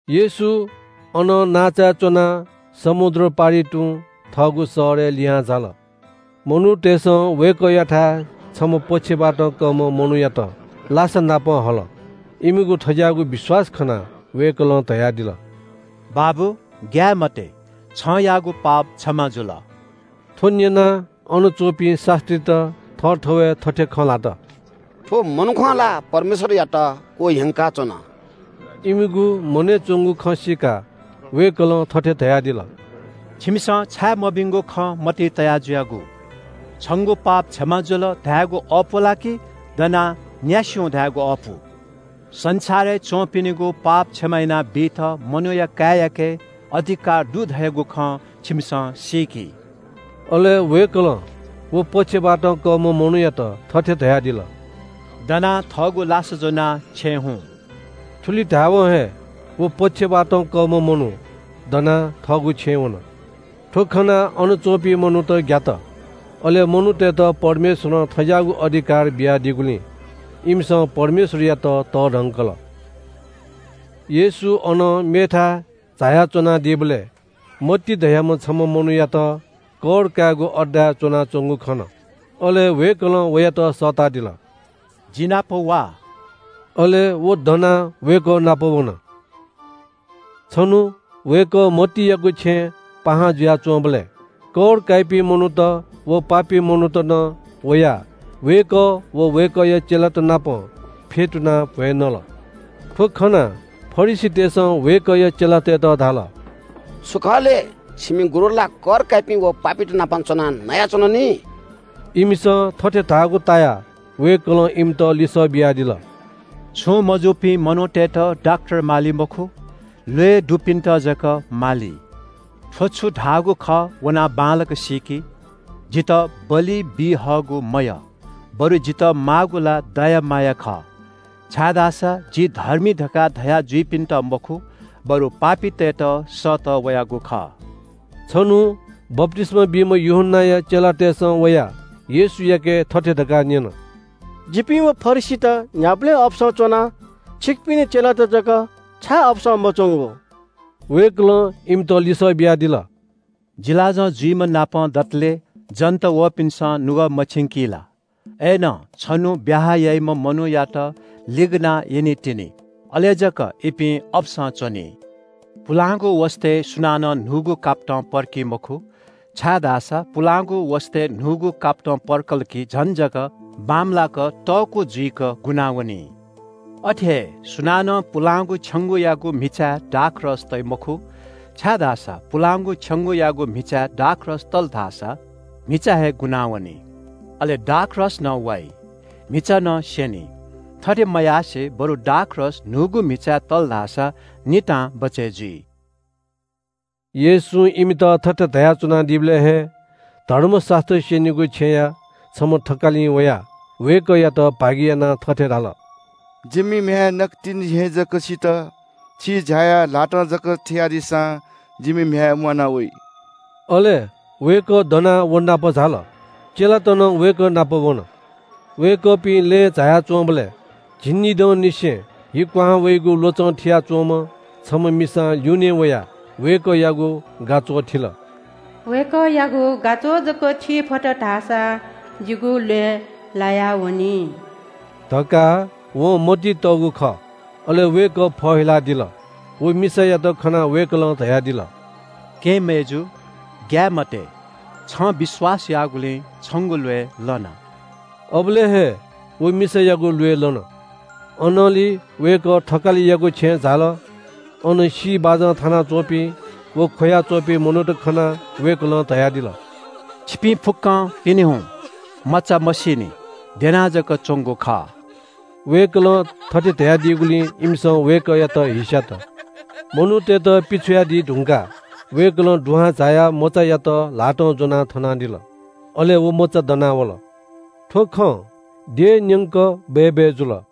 येशू अनं नांचाय् च्‍वनाः समुद्र पारि तुं थःगु शहरय् लिहां झाल। मनूतय्‌सं वय्‌कःयाथाय् छम्‍ह पक्षवातं कःम्‍ह मनूयात लासानापं हल। इमिगु थज्‍याःगु विश्‍वास खनाः वय्‌कलं धयादिल “बाबु, ग्‍याये मते, छं याःगु पाप क्षमा जुल।” थ्‍व न्‍यनाः अन च्‍वंपिं शास्‍त्रीत थःथवय् थथे खँ ल्‍हात – “थ्‍व मनुखं ला परमेश्‍वरयात क्‍वह्यंकाच्‍वन।” इमिगु मनय् च्‍वंगु खँ सीकाः वय्‌कलं थथे धयादिल – “छिमिसं छाय् मभिंगु खँ मतिइ तया जुयागु? ‘छंगु पाप क्षमा जुल’ धायेगु अःपु ला कि ‘दनाः न्‍यासि हुँ’ धायेगु अःपु? संसारय् च्‍वंपिनिगु पाप क्षमा यानाबीत मनूया काय्‌याके अधिकार दु धयागु खँ छिमिसं सीकि।” अले वय्‌कलं व पक्षवातं कःम्‍ह मनूयात थथे धयादिल – “दनाः थःगु लासा ज्‍वनाः छेँय् हुँ।” थुलि धायेवं हे व पक्षवातं कःम्‍ह मनू दनाः थःगु छेँय् वन। थ्‍व खनाः अन च्‍वंपिं मनूत ग्‍यात। अले मनूतय्‌त परमेश्‍वरं थज्‍याःगु अधिकार बियादीगुलिं इमिसं परमेश्‍वरयात तःधंकल। येशू अनं मेथाय् झायाच्‍वनादीबलय् मत्ती धयाम्‍ह छम्‍ह मनूयात कर कायेगु अड्डाय् च्‍वनाच्‍वंगु खन। अले वय्‌कलं वयात सःतादिल – “जि नाप वा।” अले व दनाः वय्‌कः नाप वन। छन्‍हु वय्‌कः मत्तीयागु छेँय् पाहां जुयाच्‍वंबलय् कर काइपिं मनूत व पापी मनूत नं वयाः वय्‌कः व वय्‌कःया चेलात नाप फ्‍यतुनाः भ्‍वय् नल। थ्‍व खनाः फरिसीतय्‌सं वय्‌कःया चेलातय्‌त धाल – “थ्‍व छु खः? छिमि गुरु ला कर काइपिं व पापीत नाप च्‍वनाः नयाच्‍वन नि?” इमिसं थथे धाःगु तायाः वय्‌कलं इमित लिसः बियादिल – “छुं मजूपिं मनूतय्‌त डाक्‍टर माली मखु, ल्‍वय् दुपिन्‍त जक माली। थ्‍व छु धाःगु खः वनाः बांलाक सीकि – ‘जितः बलि बी हःगु मयः, बरु जितः माःगु ला दया माया खः’ छाय्‌धाःसा ‘जि धर्मी’ धकाः धया जुइपिन्‍त मखु, बरु पापीतय्‌त सःतः वयागु खः।” छन्‍हु बप्‍तिस्‍मा बीम्‍ह यूहन्‍नाया चेलातय्‌सं वयाः येशूयाके थथे धकाः न्‍यन – “जिपिं व फरिसीत न्‍ह्याबलें अपसं च्‍वना, छिकपिनि चेलात जक छाय् अपसं मच्‍वंगु?” वय्‌कलं इमित लिसः बियादिल – “जिलाजं जुइम्‍हनापं दतले जन्‍त वःपिन्‍सं नुगः मछिंकी ला? अय्‌नं छन्‍हु ब्‍याहा याइम्‍ह मनूयात लिगनाः यनीतिनि। अले जक इपिं अपसं च्‍वनी। “पुलांगु वसतय् सुनानं न्‍हूगु कापतं पर्की मखु, छाय्‌धाःसा पुलांगु वसतय् न्‍हूगु कापतं पर्कल कि झन जक बांमलाक तःकू जुइक गुनावनी। “अथे हे सुनानं पुलांगु छेंगूयागु म्‍हिचाय् दाखरस तइ मखु, छाय्‌धाःसा पुलांगु छेंगूयागु म्‍हिचाय् दाखरस तल धाःसा म्‍हिचा हे गुनावनी। अले दाखरस नं वाइ, म्‍हिचा नं स्‍यनी। थथे मयासें बरु दाखरस न्‍हूगु म्‍हिचाय् तल धाःसा नितां बचय् जुइ।” येशूं इमित थथे धयाच्‍वनादीबलय् हे धर्मशास्‍त्र स्‍यनीगु छेँया छम्‍ह थकालिं वयाः वय्‌कःयात भागियानाः थथे धाल – “जिमि म्‍ह्याय् नकतिनि हे जक सित। छिं झायाः ल्‍हातं जक थियादीसां जिमि म्‍ह्याय् म्‍वाना वइ।” अले वय्‌कः दनाः व नाप झाल। चेलात नं वय्‌कः नाप वन। वय्‌कःपिं लँय् झाया च्‍वंबलय् झिंनिदंनिसें हि क्‍वहां वइगु ल्‍वचं कयाच्‍वंम्‍ह छम्‍ह मिसां ल्‍यूनें वयाः वय्‌कःयागु गाच्‍वः थिल। “वय्‌कःयागु गाच्‍वः जक थी फत धाःसा जिगु ल्‍वय् लायावनी” धकाः वं मतिइ तःगु खः। अले वय्‌कः फहिलादिल। व मिसायात खनाः वय्‌कलं धयादिल – “केहेँ मय्‌जु, ग्‍याये मते। छं विश्‍वास याःगुलिं छंगु ल्‍वय् लन।” अबलय् हे व मिसायागु ल्‍वय् लन। अनंलि वय्‌कः थकालियागु छेँय् झाल। अन सी बाजं थानाच्‍वंपिं व ख्‍वया च्‍वंपिं मनूत खनाः वय्‌कलं धयादिल – “छिपिं फुक्‍कं पिने हुँ। मचा मसीनि। द्यना जक च्‍वंगु खः।” वय्‌कलं थथे धयादीगुलिं इमिसं वय्‌कःयात हिस्‍यात। मनूतय्‌त पिछ्वयादी धुंकाः वय्‌कलं दुहां झायाः मचायात ल्‍हातं ज्‍वनाः थनादिल। अले व मचा दना वल। थ्‍व खँ देशन्‍यंक बय्‌बय् जुल।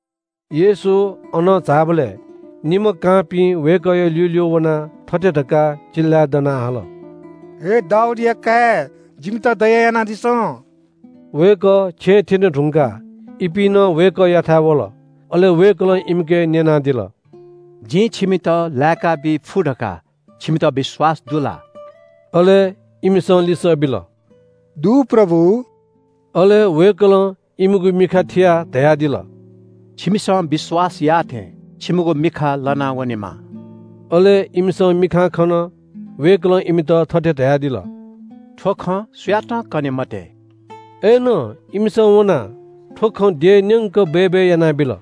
येशू अनं झाःबलय् निम्‍ह कांपिं वय्‌कःया ल्‍यूल्‍यू वनाः थथे धकाः चिल्‍लाय् दनाः हाल – “हे दाऊदया काय्, जिमित दया यानादिसँ।” वय्‌कः छेँ थ्‍यने धुंकाः इपिं नं वय्‌कःयाथाय् वल। अले वय्‌कलं इमिके न्‍यनादिल – “जिं छिमित लाय्‌काबी फु धकाः छिमित विश्‍वास दु ला?” अले इमिसं लिसः बिल – “दु, प्रभु।” अले वय्‌कलं इमिगु मिखा थियाः धयादिल – “छिमिसं विश्‍वास याःथें छिमिगु मिखा लना वनेमा।” अले इमिसं मिखां खन। वय्‌कलं इमित थथे धयादिल – “थ्‍व खँ सुयातं कने मते।” अय्‌नं इमिसं वनाः थ्‍व खँ देशन्‍यंक बय्‌बय् यानाबिल।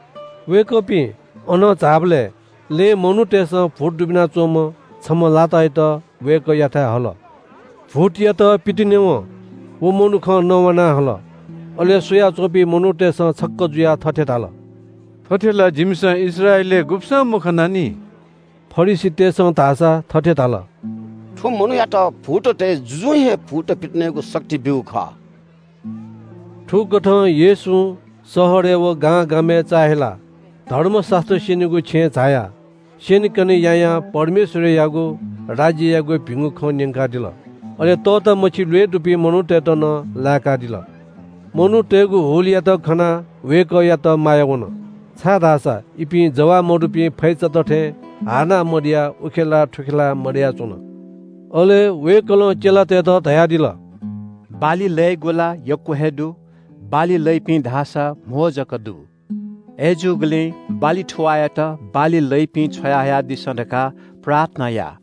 वय्‌कःपिं अनं झाःबलय् लँय् मनूतय्‌सं भूत दुबिना च्‍वंम्‍ह छम्‍ह लातायात वय्‌कःयाथाय् हल। भूतयात पितिनेवं व मनुखं नवाना हल। अले स्‍वयाच्‍वंपिं मनूतय्‌सं छक्‍क जुयाः थथे धाल – “थथे ला जिमिसं इस्राएलय् गुब्‍सं मखनानि।” फरिसीतय्‌सं धाःसा थथे धाल – “थ्‍व मनूयात भूततय् जुजुं हे भूत पितिनेगु शक्ति ब्‍यूगु खः।” थुकथं येशूं शहरय् व गांगामय् चाःहिलाः धर्मशास्‍त्र स्‍यनीगु छेँय् झायाः स्‍यनेकने यायां परमेश्‍वरयागु राज्‍ययागु भिंगु खँ न्‍यंकादिल। अले तःतामछि ल्‍वय् दुपिं मनूतय्‌त नं लाय्‌कादिल। मनूतय्‌गु हुलयात खनाः वय्‌कःयात माया वन, छाय्‌धाःसा इपिं जवाः मदुपिं फैचात थें हाःनाः मदयाः उखेलाः थुखेलाः मदयाच्‍वन। अले वय्‌कलं चेलातय्‌त धयादिल – “बाली लयेगु ला यक्‍व हे दु, बाली लइपिं धाःसा कम जक दु। अय्‌जूगुलिं बाली थुवाःयात बाली लइपिं छ्वयाहयादिसँ धकाः प्रार्थना या।”